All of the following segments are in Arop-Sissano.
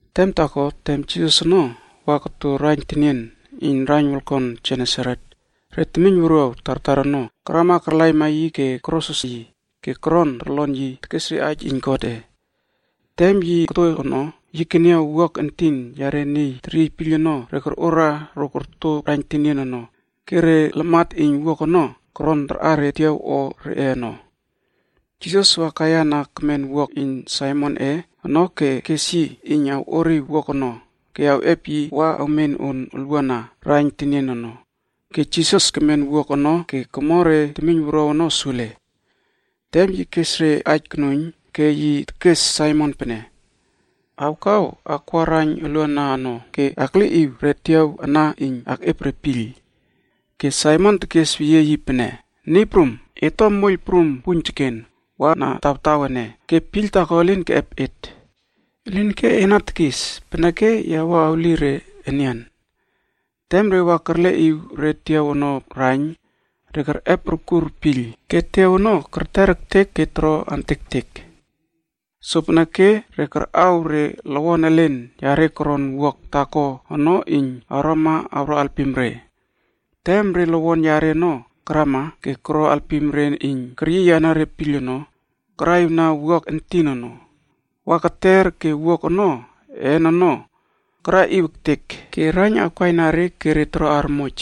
Tem taako, tem Jisas ono wa koto raiyn tenien iyn raiyn wolkon Genesaret,a re temiyn wuruaw tartar ono karama karlaima yi ke korosros yi ke koron torlon yi tekes re aij iyn Godꞌe. Tem yi koto ono, yi keniaw pinas entin yare niy teryiy piyl ono, re korꞌora ro korto raiyn tenien ono ke re lamat iyn pinas ono koron tarꞌa re tiaw o reꞌe ono. Jisas wa kaiyana kemen pinas iyn Saimonꞌe ono ke kes yi iyn awꞌoriw pinas ono ke awꞌep yi wa awmen on ulwuana raiyn tenien ono. Ke Jisas kemen pinas ono ke komo re temiyn wuruaw ono sule. Tem yi kes re aij konuiyn ke yi tekes Saimon pene, “Awkaw akwa raiyn uluana ono ke akleꞌiw re tiaw ana iyn akꞌep re piyl.” Ke Saimon tekesweyie yi pene, “Niy prum, et to moiyl prum puiyn teken wa na tawtaw ene ke piyl taako elin keꞌep et. Elinke ena tekis peneke ya wua awli re enian.” Tem re wa kerleꞌiw re tiaw ono raiyn, re kerꞌep urkur piyl ke tiaw ono kerter ektek ke toro amtektek. Sopeneke re karꞌaw re lowon elen reꞌe koron pinas taako ono iyn awrama awro alpim re. Ke tem re lowon yare ono karama ke koro alpim re iyn keryiyana re piyl ono karaꞌiwna pinas entin ono wa kerter ke pinas een ono karaꞌiw ektek ke raiyn ono awkaina re ke re toro armoj.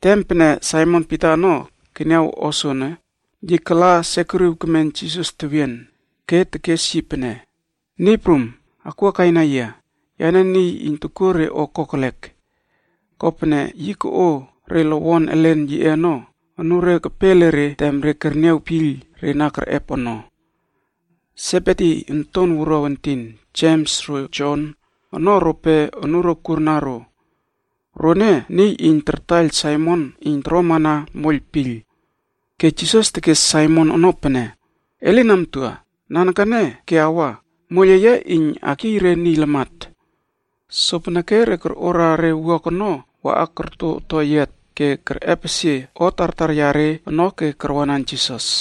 Tem pene Saimon Pita ono keniaw o soono, yi kala sekuriw kemen Jisas tewien ke tekes yi pene, “Niy Prum, akwuakaina yia, yane niy iyn tokuo re o kokelek.” Kopene yi koꞌo re lowon elen yiꞌe ono anure kepe ele re tem re kerniaw piyl re na kerꞌep ono. Sebedi onton wuruaw entin Jems ro Jon ono rope anuro kurna ro. Rone niy iyn tartaiyl Saimon iyn toromana moiyl piyl. Ke Jisas tekes Saimon ono pene, “E lin amtua, nanekene ke awa, moiyl eye iyn akyiy re niy lamat.” Sopeneke re korꞌora re pinas ono waꞌa wa korto toyiat ono ke kerꞌepesie o tartar reꞌe ono ke karwanan Jisas.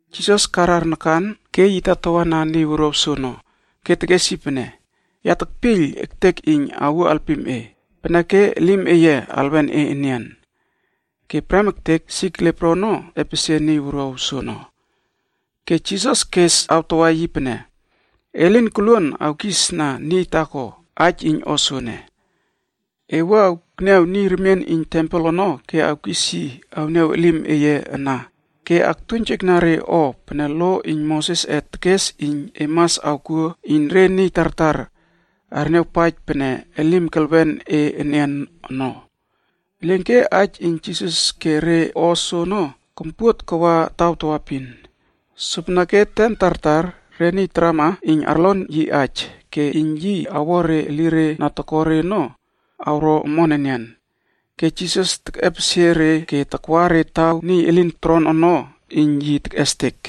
Jisas karar nakan ke yi tatawa na niy wuruaw soono ke tekes yi pene, “Ya tekpiyl ektek iyn awuo alpim e, peneke elim eye alwen e enian.” Ke prem ektek sik lepro ono epesie niy wuruaw soono. Ke Jisas kes awtawa yi pene, “E lin koluon awkisna niy taako aij iyn o soene. E wua akniaw niy remien iyn tempel ono ke awkis yi awniaw elim eye ana ke aktuiynjekna re o pene lo iyn Mosesꞌe tekes iyn e mas awkuo iyn re niy tartar arniawpaij pene elim kelwen e enian ono.” Elinke aij iyn Jisas ke re o soono kompuot kawa tawaepin. Sopeneke tem tartar re niy tartar tarama iyn arlon yi aij ke iyn yi awo re elire na toko re ono awro omon enian. Ke Jisas tekꞌepesie re ke takwa re taw niy elin toron ono iyn yi tekꞌestek.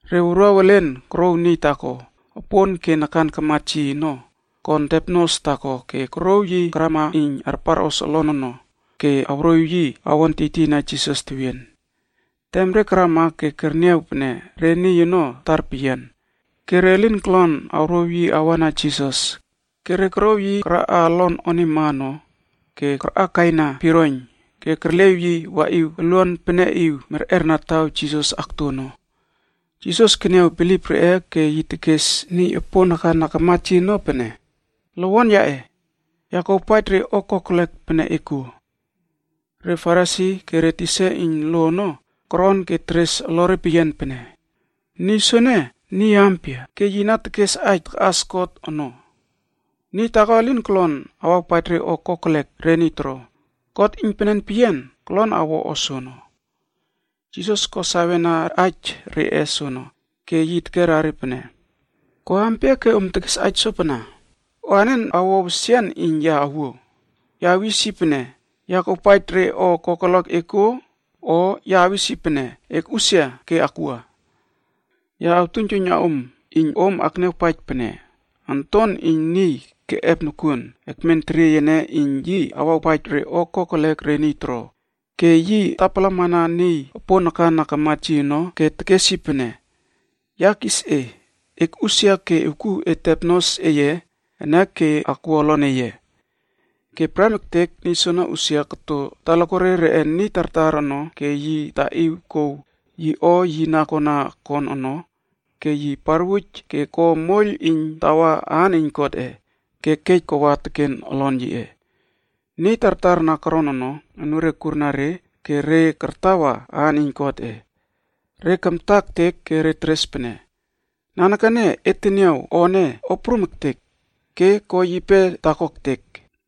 Re wuruaw elen korouw niy taako opon ke nakan karmat yi ono kon tepnos taako ke korouw yi karama iyn arparꞌos olon ono ke awroꞌiw yi awon tiytiyna Jisas tewien. Tem re karama ke kerniaw pene re niy ono tar peyian ke re lin kolon awrouw yi awa na Jisas, ke re korouw yi karaꞌa olon onima ono ke karꞌakaina piroiyn ke kerleꞌiw yi waꞌiw oluan peneꞌiw merꞌerna taw Jisas akto ono. Jisas keniaw bilip reꞌe ke yi tekes niy opon nakan na kamat yi ono pene, “Lowon yaꞌe, ya kuawpaij re o kokelek pene e kuo.” Re Farisi ke re tisa iyn lo ono koron ke teres olore peyian pene, “Niy soene niy ampia ke yi na tekes aij takꞌas God ono? Niy taako elin kolon awawpaij re o kokelek re niy toro, God iynpenen peyian kolon awawpaij re o kokelek re niy toro.” Jisas ko sawena aij reꞌe soono ke yi tekerna re pene, “Ko ampia ke om tekes aij sopana? O anen awo wesian iyn ya awuo? Ya awis yi pene, ‘Ya kuawpaij re o kokelek e kuo,’ o ya awis yi pene, ‘Ekꞌusia ke akwua.’ Ya awtuiynjuiyna om iyn om akniawpaij pene Onton iyn Niyc keꞌep nokuon ekmen teriey ene iyn yi awawpaij re o kokelek re niy toro.” Ke yi tapalamana niy opon nakan na kamat yi ono ke tekes yi pene, “Ya kis e, akꞌusia ke ewkuw e tepnos eye ene ke akwua olon eye.” Ke prem ektek niy soono usia koto talakuare reꞌe niy tartar ono ke yi taꞌiw kouw yi o yi na kona kon ono ke yi parwuj ke ko moiyl iyn tawa aan iyn Godꞌe ke kej kawa teken olon yiꞌe. Niy tartar na koron ono anure kurna re ke re kartawa aan iyn Godꞌe. Re kamta ektek ke re teres pene, “Nanekene et teniaw o ene o prum ektek ke ko yipe taako ektek!”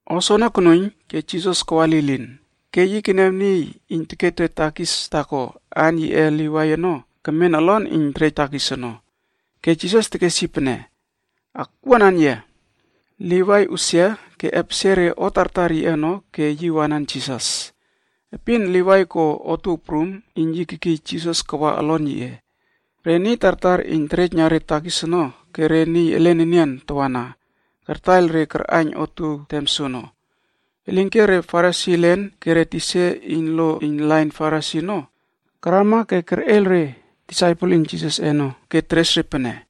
O soono konuiyn ke Jisas kawa lilin ke yi keniaw taako reꞌe niy iyn tekejna re temiyn wuruaw takis, aan yiꞌe Livai.d ono kemen olon iyn terej takis ono. Ke Jisas tekes yi pene, “Ewkuama ke Akwuanan yia.” Livai usia ke epesie re o tartar yiꞌe ono ke yi wanan Jisas. Epin Livai ko otuow prum ke yi kekiy Jisas kawa olon yiꞌe. Ke tartar reꞌe niy iyn terejna re temiyn wuruaw takis ono ke re niy elen enian tawana kartaiyltaiyl re karꞌaiyn otuow tem soono. Elinke re Farisi elen ke re tisa iyn lo iyn lain Farisi ono karama ke kerꞌeiyl re disaipel iyn Jisasꞌe ono ke teres re pene,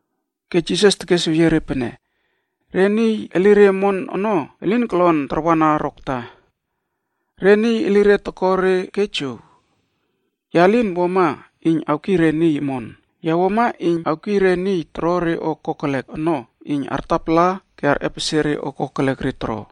Ke Jisas tekesweyie re pene, “Re niy elire omon ono elin kolon tarwana rokta. Re niy elire toko re ke jow. Ya lin wuama iyn awkiy re niy omon, ya wuama iyn awkiy re niy toro re o kokelek ono iyn artapala ke arꞌepesie re o kokelek re toro.”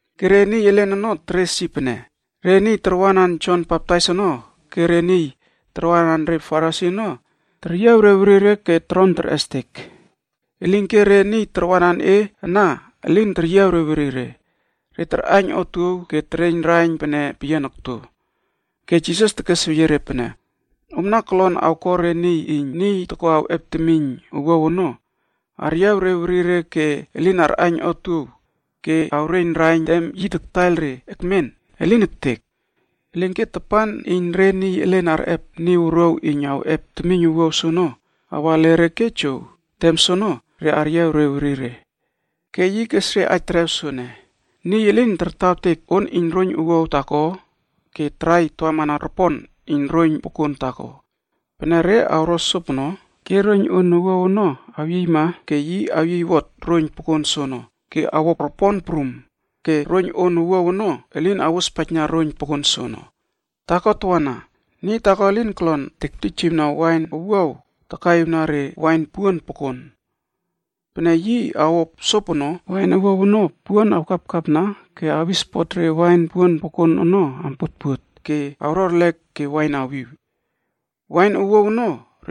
Ke re niy elen ono teres yi pene, “Re disaipel iyn Jon Baptais ono ke re disaipel reꞌe Farisi ono teryiaw re werire ke toron terꞌestek. Elinke re disaipel eye ana elin teryiaw re werire, re tarꞌaiyn otuow ke tereiyn raiyn pene peyian okto.” Ke Jisas tekesweyie re pene, “Omna kolon awko re niy iyn niy toko awꞌep temiyn owuaw ono aryiaw re werire ke elin arꞌaiyn otuow ke awreiyn raiyn tem yi taktaiyl re ekmen? Elin ektek! Elinke tapan iyn re niy elen arꞌep niy wuruaw iyn awꞌep temiyn owuaw soono awa ele re ke jow, tem soono re aryiaw re werire.” Ke yi kes re aij terew soene, “Niy elin tartawtek on iyn roiyn owuaw taako ke tarai tawamana ropon iyn roiyn pokon taako. Pene re awro sopono ke roiyn on owuaw ono awyiyma ke yi awyiywot roiyn pokon soono ke awo ropon prum, ke roiyn on owuaw ono elin awospaijna roiyn pokon soono. Taako tawana, niy taako elin kolon tektijiwna wain owuaw takaꞌiwna re wain puon pokon. Pene yi awo sopono, wain owuaw ono pouon awkapkapna ke awispot re wain puon pokon ono ampuotpuot ke awro erlek ke wain awiw. Wain owuaw ono,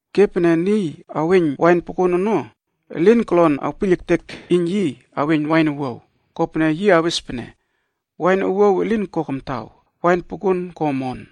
Ke pene niy aweiyn wain pokon ono, elin kolon awpiyl ektek iyn yi aweiyn wain owuaw, kopene yi awes pene, ‘Wain owuaw elin ko kamtaw, wain pokon ko omon.’”